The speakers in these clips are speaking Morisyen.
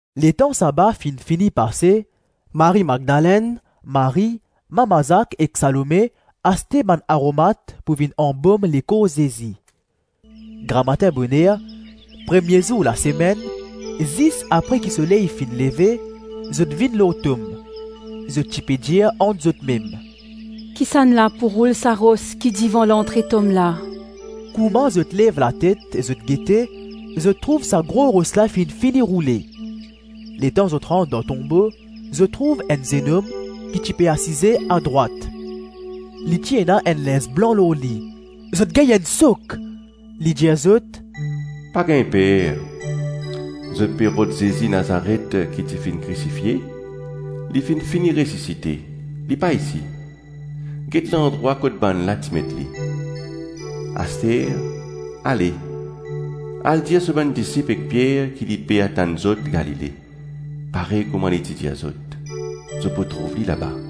Letan saba finn fini pase, Marie-Madlenn, Marie, mama Zak ek Salome aste bann aromat pou vinn anbom lekor Zezi. Gramatin boner, premie zour lasemenn, zis apre ki soley finn leve, zot vinn lor tom. Zot ti pe dir ant zotmem, “Kisannla pou roul sa ros ki devan lantre tom la?” Kouma zot lev latet, zot gete, zot trouv sa gro ros la finn fini roule. Letan zot rant dan tonbo, zot trouv enn zennom ki ti pe asize adrwat. Li ti ena enn linz blan lor li. Zot gagn enn sok. Li dir zot, “Pa gagn per, zot ape rod Zezi Nazaret ki ti finn krisifie; li finn fini resisite, li pa isi. Get landrwa kot bannla ti met li. Aster, ale, al dir so bann disip ek Pier ki li pe atann zot Galile, parey kouma li ti dir zot. Zot pou trouv li laba.”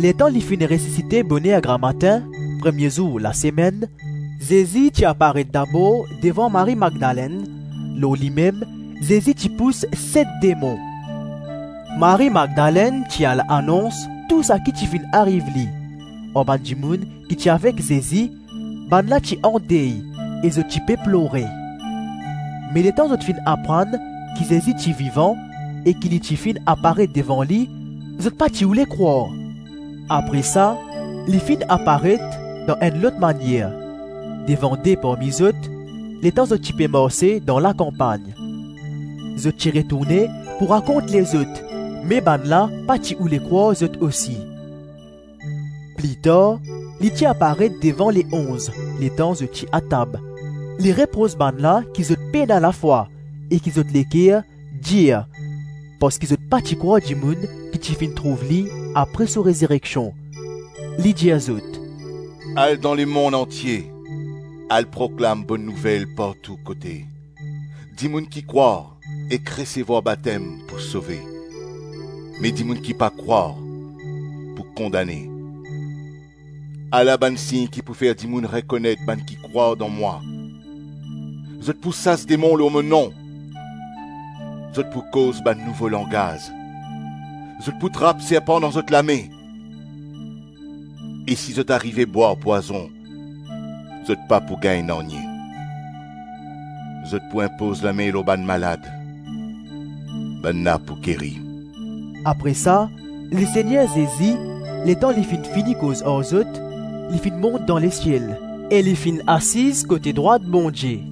Letan li finn resisite boner gramatin, premie zour lasemenn, Zezi ti aparet dabor devan Marie-Madlenn; lor limem Zezi ti pous set demon. Marie-Madlenn ti al anons tou saki ti finn ariv li, ar bann dimoun ki ti avek Zezi; bannla ti andey e zot ti pe plore. Me letan zot finn aprann ki Zezi ti vivan e ki li ti finn aparet devan li, zot pa ti oule krwar. Apre sa, li finn aparet, dan enn lot manier, devan de parmi zot, letan zot ti pe marse dan lakanpagn. Zot ti retourne pou rakont lezot; me bannla pa ti oule krwar zot osi. Pli tar, li ti aparet devan Le-Onz, letan zot ti atab; li repros bannla ki zot pena lafwa e ki zot leker dir parski zot pa ti krwar dimoun ki ti finn trouv li apre so rezireksion. Li dir zot, “Al dan lemonn antie, al proklam Bonn Nouvel partou kote. Dimoun ki krwar ek resevwar batem pou sove, me dimoun ki pa krwar pou kondane. Ala bann sign ki pou fer dimoun rekonet bann ki krwar dan mwa: zot pou sas demon lor mo nom, zot pou koz bann nouvo langaz, zot pou trap serpan dan zot lame e si zot arive bwar pwazon, zot pa pou gagn nanye; zot pou inpoz lame lor bann malad, bannla pou geri.” Apre sa, Lesegner Zezi, letan li finn fini koz ar zot, li finn mont dan lesiel e li finn asiz kote drwat Bondie.